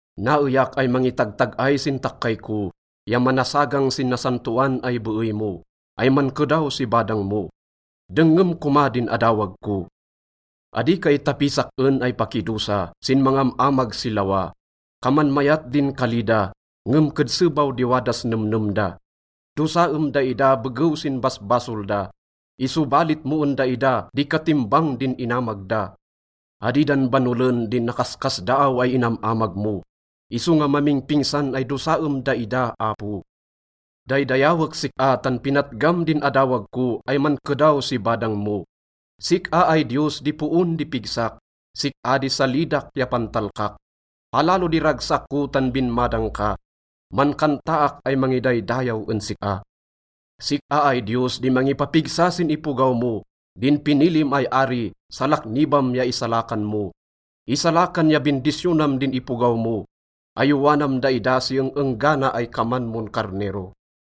Naeyak ay mangitagtag-ay sin takkay ko ya manasagang sin nasantaon ay beey mo, ay mankedaw si badang mo. Dengngem koma din adawag ko. Adi ka itapis sak-en ay pakidosa sin mangam-amag si lawa. Kaman mayat din kali da, ngem kedse baw di wadas nemnem da. Dosaem daida begew sin basbasol da, isobalit mo en daida di katimbang din inamag da. Adi dan banolen din nakaskasdaaw ay inam-amag mo, isonga mamingpingsan ay dosaem daida, Apo. Daydayawek sik-a tan pinatgam din adawag ko ay mankedaw si badang mo. Sik-a ay Diyos di poon di pigsak, sik-a di salidak ya pantalkak. Palalo di ragsak ko tan binmadang ka, mankantaak ay mangidaydayaw en sik-a. Sik-a ay Diyos di mangipapigsa sin ipogaw mo, din pinilim ay ari, salaknibam ya isalakan mo. Isalakan ya bindisyonam din ipogaw mo, ayowanam daida si eng-enggana ay kaman mon karnero.